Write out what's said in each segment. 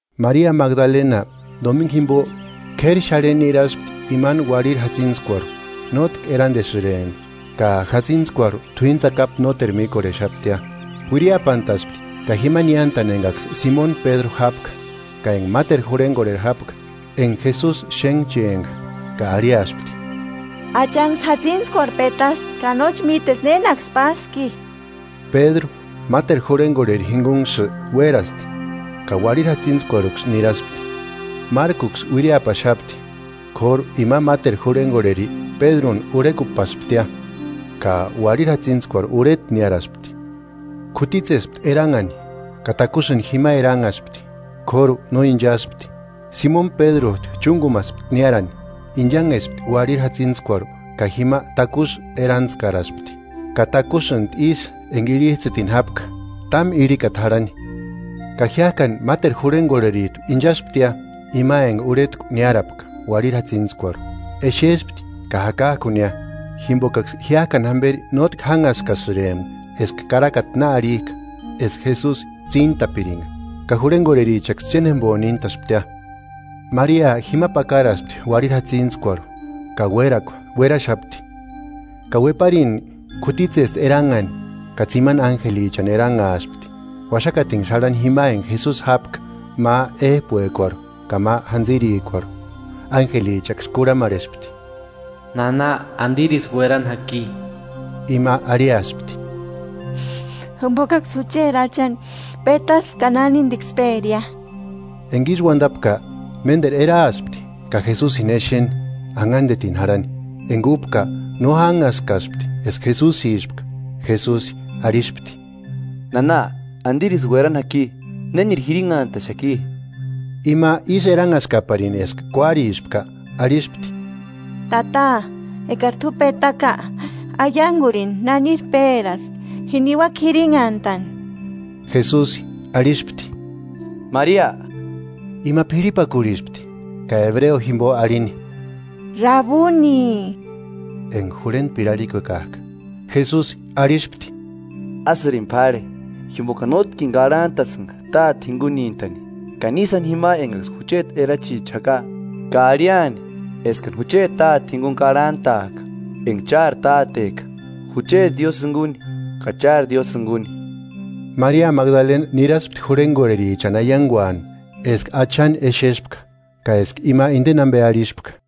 Maria Magdalena Domingu jimbo k'éri xarhentku niraspti imani uarhiri jatsintskuarhu, nótki erandesïrempti, ka jatsïntskuarhu t'uíni tsakapu nóteru míkorhexaptia. Uiriapantaspti ka jima niántani engaksï Simoni Pédru jápka ka enga máteru jurhegorheri jápka enga Jesusi xénhchempka, ka arhiaspti: –¡Achanksï jatsintskuarhu petasti, ka nóchi míteska nénaksi páski! Pédru máteru jurhengorheri jingunksï uérasti, ka uarhiri jatsintskuarhuksï niraspti. Márkuksï uiriapaxapti, k'óru ima máteru jurhengorheri Pédruni urhekupasptia, ka uarhiri jatsintskuarhu urheta niáraspti. K'utitsespti eranhani ka takusïni jima eranhaspti, k'óru no inchaspti. Simoni Pédrujtu chúngumaspti niárani, inchanhespti uarhiri jatsintskuarhu ka jima takusï erantskaraspti; ka takusïntu isï enga irhijtsïtini jápka, támu irhikata jarhani. Ka jiájkani máteru jurhengorherijtu inchasptia, ima enga urhetku niárapka uarhiri jatsintskuarhu; exespti ka jakajkunia. Jimbokaksï jiájkani jamberi nótki jánhaskasïrempka eska karakata na arhijka eska Jesusi tsíntapiringa. Ka jurhengorherichaksï chénjembo níntasptia. Maria jima pakaraspti uarhiri jatsintskuarhu ka uérakua, ueraxapti. Ka ueparini k'utitsespti eranhani, ka tsimani ánjelichani eranhaaspti, uaxakatinksï jarhani jima enga Jesusi jápka, ma éjpuekuarhu ka ma jantsïrikuarhu. Ánjelichaksï kurhamarhespti: –Nana, ¿Andirisï uerani jaki? Ima arhiaspti: –Jimbokaksï jucheti Achani petaska ka nánindiksï péria. Enga ísï uandapka, ménderu eraaspti ka Jesusini exeni, anhandetini jarhani, enga úpka no janhaskaspti eska Jesusispka. Jesusi arhispti: –Nana, ¿Andirisï uérani jaki? ¿Néniri jirinhantaxaki? Ima ísï eranhaskaparini eska kuárispka arhispti: –Tata, eka t'u petaka, aiangurini naniri péraski, ji niuaka jirinhantani. Jesusi arhispti: –¡Maria! Ima p'irhipakurhispti ka ebreo jimbo arhini: –¡Rabuni! (Enga “Jurhentpiri” arhikuekajka) Jesusi arhispti: –Ásïrini p'árhe, jimbokani nótkini karhantasïnga Táte jingunintani. Ka ni sáni jima engaksï jucheti erachicha jaka ka arhiani eskani jucheti Táte jinguni karhantaaka, enga chári Táteka, jucheti Diósï jinguni ka chári Diósï jinguni. Maria Magdalena niraspti jurhengorherichani aianguani eska Achani exespka ka eska ima indeni ambe arhispka.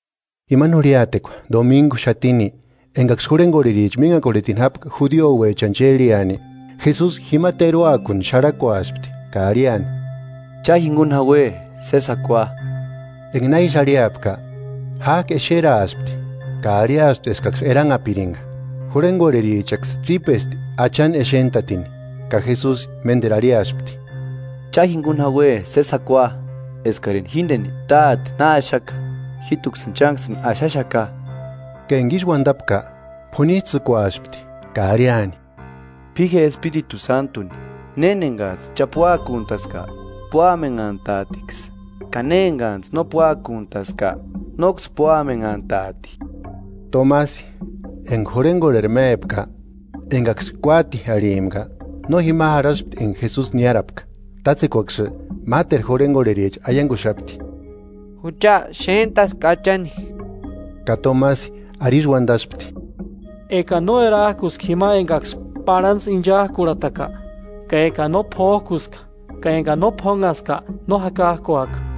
Imani jurhiatekua, domingu xatini engaksï jurhengorhericha minhakorhetini jápka judiouechani chérheani; Jesusi jima teruakuni xarhakuaspti ka arhiani: ¡Cha jinguni jaue sési jakua! Enga na ísï arhiapka, jájki exeraaspti ka arhiaspti eskaksï eranhapiringa. Jurhengorherichaksï tsípespti Achani exentatini. Ka Jesusi ménderu arhiaspti. –¡Cha jinguni jaue sési jakua! Eskarini jíndeni Táte na axaka, jíjtuksïni chánksïni axaxaka. Ka enga ísï uandapka, p'unijtsïkuaspti ka arhiani: –P'i je Espiritu Sántuni. Néni enga xáni cha puákuantaska, púamenhantaatiksï; ka ne enganijtsï no puákuntaska, nóksï púamenhantaati. Tomasi, enga jurhengorheri mépka, engaksï kuati arhimpka, no jima jarhaspti enga Jesusi niárapka. Tátsekuaksï máteru jurhengorhericha aianguxapti: –Jucha xéntaska Achani. Ka Tomasi arisï uandaspti: –Ekani no erajkuska jima engaksï parhantsï inchajkurhataka ka ekani no p'ójkuska ka ekani no p'ónhaska; no jakajkuaka.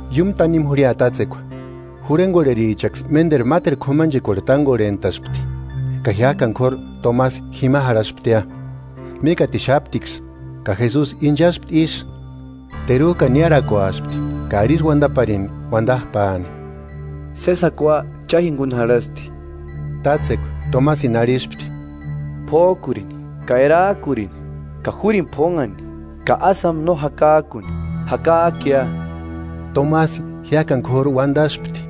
Iúmu tanimu jurhia tátsekua, jurhengorherichaksï ménderu máteru k'umanchekuarhu tángorhentaspti, ka jiájkani k'óru Tomasi jima jarhasptia. Mikatixaptiksï, ka Jesusi inchaspti ísï, terujkani niárakuaspti ka arisï uandaparini uandajpaani: –Sési jakua cha jinguni jarhasti. Tátsekua Tomasini arhispti: –P'ójkurini, ka erajkurini; ka júrini p'ónhani, ka ásï jáma no jakajkuni, jakajkuia. Tomasi jiájkani k'óru uandaspti: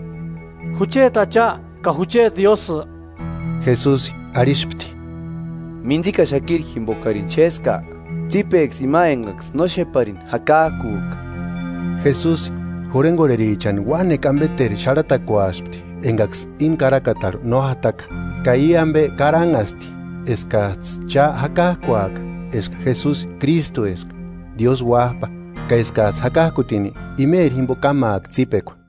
–¡Jucheti Acha ka jucheti Diósï! Jesusi arhispti: –¿Mintsikaxakiri jimbokarini xéska? ¡Tsípeksï ima engaksï no xéparini jakakujka! Jesusi jurhengorherichani uánekua ambeteru xarhatakuaspti engaksï íni karakatarhu no jataka. Ka i ambe karanhasti eskajtsï cha jakajkuaka eska Jesusi Krístueska, Diósï Uájpa, ka eskajtsï jakajkutini, imeri jimbo kámaaka tsípekua.